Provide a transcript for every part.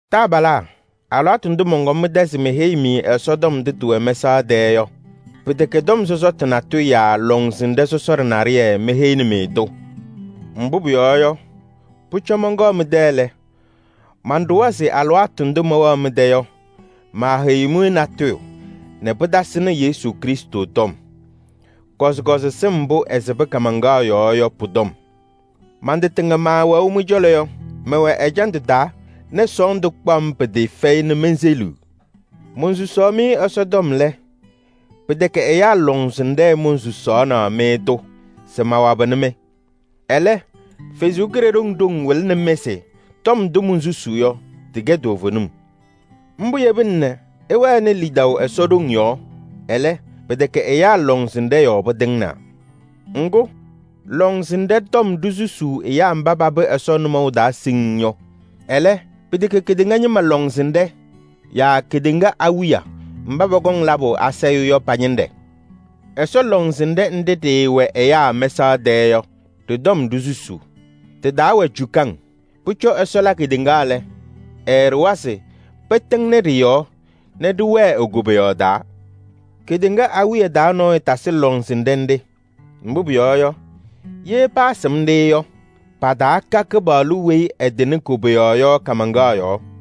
Taabalaa, alɩwaatʋ ndʋ mɔnkɔm mɩ-tɛ se meheyi-mɩ Ɛsɔ tɔm ndʋ tɩwɛ mɛsaɣ tɛɛ yɔ, pɩtɛkɛ tɔm sɔsɔtʋ natʋyʋ yaa lɔŋsɩnɖɛ sɔsɔɖɛ naɖɩyɛ meheyini-mɩ-tʋ. Mbʋ pʋyɔɔ yɔ, pʋcɔ mɔnkɔɔ mɩ-tɛ lɛ, manɖʋwa se alɩwaatʋ ndʋ mɛwɛɣ mɩ-tɛ yɔ, maaheyiɣ-mɩ natʋyʋ nɛ pɩtasɩnɩ Yesu Krɩstʋ tɔm. Kɔzɩkɔzɩ sɩm mbʋ ɛsɩbɩ kaamaŋkaɣ yɔɔ yɔ pʋ-tɔm. Man-tɩ tɩŋa maawɛʋ mɩ-cɔlɔ yɔ, mɛwɛ ɛjandʋ taa nɛ sɔɔndʋ kpaɣ-m pɩtɩɩfɛyɩ nɛ menseliɣ. Monsusaɣ-mɩ Ɛsɔtɔm lɛ, pɩtɛkɛ ɛyaa lɔŋsɩnɖɛ monsusaɣnɩ-mɩ-tʋ se mawabɩnɩ-mɩ. Ɛlɛ, Ɛsɔ Kalɩzaɣ ɖoŋ wɩlɩnɩ-mɩ se tɔm ndʋ monsusuu yɔ, tɩkɛ toovenim. Mbʋ yebina nɛ ɩwɛnɩ lidaʋ Ɛsɔ ɖoŋ yɔɔ. Ɛlɛ, pɩtɛkɛ ɛyaa lɔŋsɩnɖɛ yɔɔ pɩtɩŋnaa. Ŋgʋ, lɔŋsɩnɖɛ tɔm ɖisusuu ɛyaa mba papɩ Ɛsɔ nʋmɔʋ taa siŋŋ yɔ. Ɛlɛ, pɩtɛkɛ kedeŋa ñɩma lɔŋsɩnɖɛ yaa kedeŋa awiya mba pɔkɔŋ labʋ asayʋʋ yɔ pa-ñɩnɖɛ. Ɛsɔ lɔŋsɩnɖɛ nɖɩ ɖɩɩwɛ ɛyaa mɛsaɣ tɛɛ yɔ, ɖɩ-tɔm ɖisusuu. Tɩ-taa wɛ cukaŋ. Pʋcɔ Ɛsɔ la kedeŋa lɛ, ɛɛɖʋwa se pɩtɩŋnɩ ɖɩ-yɔɔ nɛ ɖɩwɛɛ e-koboyaɣ taa. Kedeŋa awiya taa nɔɔyʋ tasɩ lɔŋsɩnɖɛ nɖɩ. Mbʋ pʋyɔɔ yɔ, ye paasɩm-ɖɩ yɔ, pataaka Kɩpaɣlʋ weyi ɛtɩnɩ koboyaɣ yɔ kaamaŋkaɣ yɔɔ.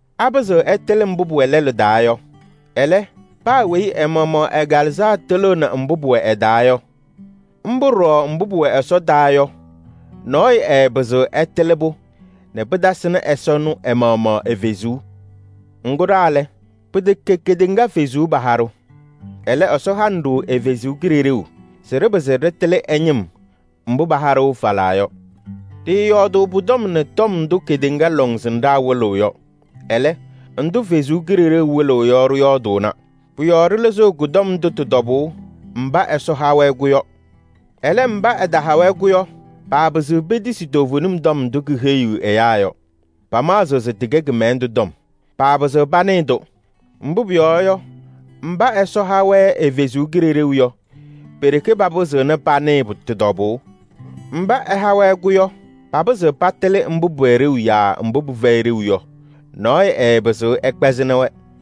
Ɛyʋ ɛɛpɩzɩɣ ɛtɩlɩ mbʋ pʋwɛ lɛlʋ taa yɔ. Ɛlɛ, paa weyi ɛ-maɣmaɣ ɛ-kalɩzaɣ tɩlɩɣnɩ mbʋ pʋwɛ ɛ-taa yɔ. Mbʋ ɖɔɖɔ mbʋ pʋwɛ Ɛsɔ taa yɔ, nɔɔyʋ ɛɛpɩzɩɣ ɛtɩlɩ-pʋ nɛ pɩtasɩnɩ Ɛsɔ ɛnʋ ɛ-maɣmaɣ ɛ-Kalɩzaɣ. Ŋgʋ ɖa lɛ, pɩtɛkɛ kedeŋa kalɩzaɣ paha-ɖʋ. Ɛlɛ, Ɛsɔ hanɩ-ɖʋ ɛ-Kalɩzaɣ se ɖɩpɩzɩ ɖɩtɩlɩ ɛ-ñɩm mbʋ paha-ɖʋ falaa yɔ. Ɖɩɩyɔɔdʋʋ pʋ-tɔm nɛ tɔm ndʋ kedeŋa lɔŋsɩnɖaa wɩlɩɣ yɔ. Ɛlɛ, ndʋ Ɛsɔ Kalɩzaɣ wɩlɩɣ yɔ ɖɩyɔɔdʋʋna. Pʋ-yɔɔ ɖɩlɩzɩɣ kɔ-tɔm ndʋ tɩ-tɔbʋʋ mba Ɛsɔ ha-wɛ-kɛ yɔ. Ɛlɛ, mba ɛtaha-wɛ-kɛ yɔ, paapɩzɩɣ petisi toovenim tɔm ndʋ keheyiɣ ɛyaa yɔ. Pamaɣzɩɣ se tɩkɛ kɩmɛlɛndʋ tɔm. Paapɩzɩɣ panɩɩ-tʋ. Mbʋ pʋyɔɔ yɔ, mba Ɛsɔ ha-wɛ ɛ-Kalɩzaɣ yɔ pe-ɖeke papɩzɩɣna panɩɩ tɩ-tɔbʋʋ. Mba ɛha-wɛ-kɛ yɔ, papɩzɩɣ patɩlɩ mbʋ pʋwɛ ɖeu yaa mbʋ pɩfɛyɩ ɖeu yɔ. Nɔɔyʋ ɛɛpɩzɩɣ ɛkpɛzɩnɩ-wɛ.